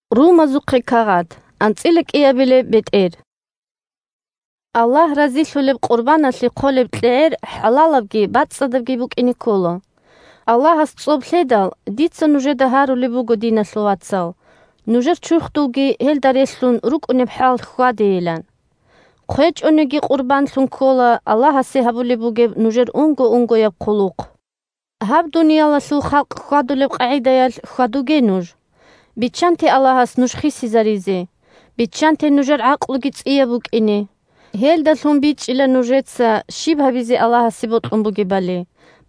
«Гьаб дуниялалъул халкъ хьвадулеб къагӀидаялъ хьвадуге нуж» Аллагь разилъулеб къурбаналъе хъолеб кьегӀер хӀалалабги бацӀцӀадабги букӀине ккола. Аллагьас цӀоб лъедал, дица нужеда гьарулеб буго, диналъул вацал, нужер чурхдулги гьелда релълъун рукӀунеб хӀалалъ хьвадейилан. ХъвечӀониги къурбанлъун ккола Аллагьасе гьабулеб бугеб нужер унго-унгояб хъулухъ. Гьаб дуниялалъул халкъ хьвадулеб къагӀидаялъ хьвадуге нуж. Биччанте Аллагьас нуж хисизаризе, биччанте нужер гӀакълуги цӀияб букӀине. Гьелдалъун бичӀчӀила нужеца щиб гьабизе Аллагьасе бокьун бугебали,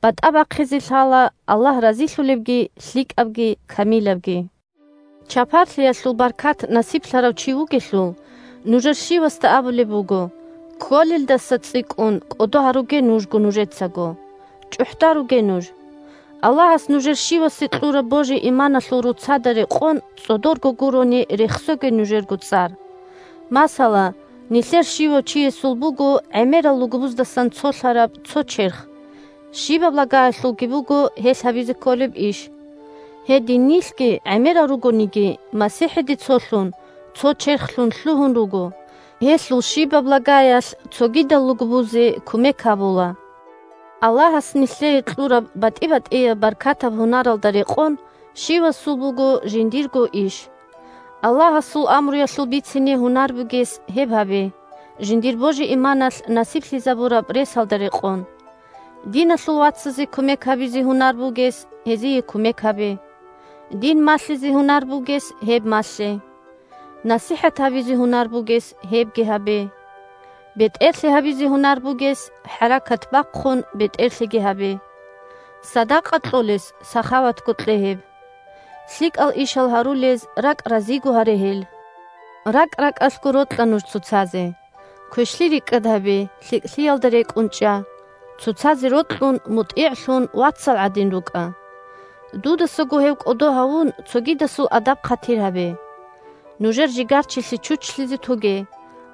батӀа бахъизе лъала Аллагь разилъулебги, лъикӀабги, камилабги. Чапарлъиялъул баркат насиблъарав чи вугелъул, нужер щивасда абулеб буго, кколелдаса цӀикӀкӀун кӀодо гьаруге нужго нужецаго. ЧӀухӀдаруге нуж. Аллагьас нужер щивасе кьураб божи-иманалъул роцада рекъон цӀодорго гурони рехсоге нужерго цӀар. Масала, нилъер щивав чиясул буго гӀемерал лугбуздасан цолъараб цо черх, щибаб лагаялъулги буго гьелъ гьабизе кколеб иш. Гьедин нилъги, гӀемерал ругониги, МасихӀиде цолъун, цо черхлъун лъугьун руго, гьелъул щибаб лагаялъ цогидал лугбузе кумек гьабула. Аллагьас нилъее кьураб батӀи-батӀияб баркатаб гьунаралда рекъон, щивасул буго жиндирго иш. Аллагьасул амруялъул бицине гьунар бугес гьеб гьабе, жиндир божи-иманалъ насиблъизабураб ресалда рекъон. Диналъул вацазе кумек гьабизе гьунар бугес, гьезие кумек гьабе. Дин малъизе гьунар бугес гьеб малъе. НасихӀат гьабизе гьунар бугес гьебги гьабе. БетӀерлъи гьабизе гьунар бугес, хӀаракат бахъун, бетӀерлъиги гьабе. Садакъа кьолес сахаватго кье гьеб. ЛъикӀал ишал гьарулез ракӀ разиго гьаре гьел. РакӀ-ракӀалъго рокьа нуж цоцазе. Квешлъи рикӀкӀад гьабе, лъикӀлъиялда рекӀун чӀа. Цоцазе рокьун, мутӀигӀлъун, вацал гӀадин рукӀа. Дудасаго гьев кӀодо гьавун, цогидасул адаб-хъатир гьабе. Нужер жигарчилъи чучлъизе тоге,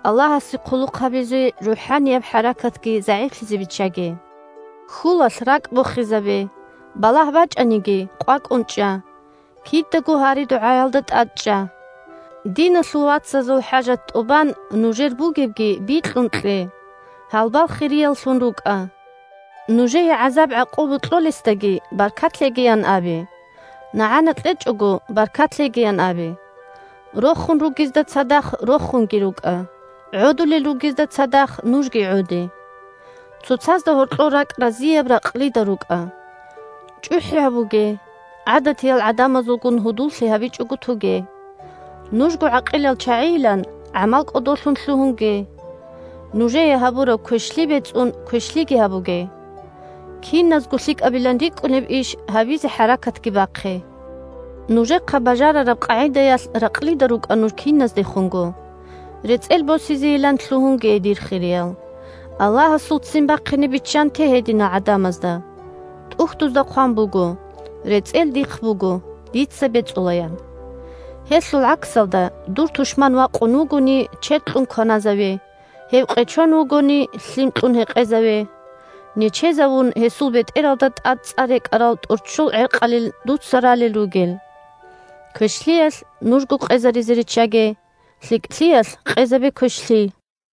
Аллагьасе хъулухъ гьабизе рухӀанияб хӀаракатги загӀиплъизе биччаге. Хьулалъ ракӀ бохизабе. Балагь бачӀаниги, къвакӀун чӀа. Кидаго гьари-дугӀаялда тӀадчӀа. Диналъул вацазул хӀажат тӀубан, нужер бугебги бикьун кье. Гьалбал хирияллъун рукӀа. Нужее гӀазаб-гӀакъуба кьолесдаги баркат лъегиян абе. НагӀана кьечӀого, баркат лъегиян абе! Рохун ругезда цадахъ рохунги рукӀа, гӀодулел ругезда цадахъ нужги гӀоде. Цоцазда гьоркьор ракӀ разияб ракълида рукӀа. ЧӀухӀи гьабуге, гӀадатиял гӀадамазулгун гьудуллъи гьабичӀого тоге. Нужго гӀакъилал чагӀийилан, гӀамал кӀодолъун лъугьунге. Нужее гьабураб квешлъи бецӀун квешлъиги гьабуге. Киназго лъикӀабилан рикӀкӀунеб иш гьабизе хӀаракатги бахъе. Нужехъа бажарараб къагӀидаялъ ракълида рукӀа нуж киназдехунго. РецӀел босизейилан лъугьунге, дир хириял. Аллагьасул ццин бахъине биччанте гьединал гӀадамазда. ТӀухьдузда хъван буго: «РецӀел Дихъ буго, Дица бецӀула», – ян. Гьелъул гӀаксалда: «Дур тушман вакъун вугони, чед кьун кваназаве, гьев къечон вугони, лъим кьун гьекъезаве. Нечезавун гьесул бетӀералда тӀаде цӀа рекӀарал тӀорччол гӀеркъалин дуца ралел ругел». Квешлъиялъ нужго къезаризе риччаге, лъикӀлъиялъ къезабе квешлъи!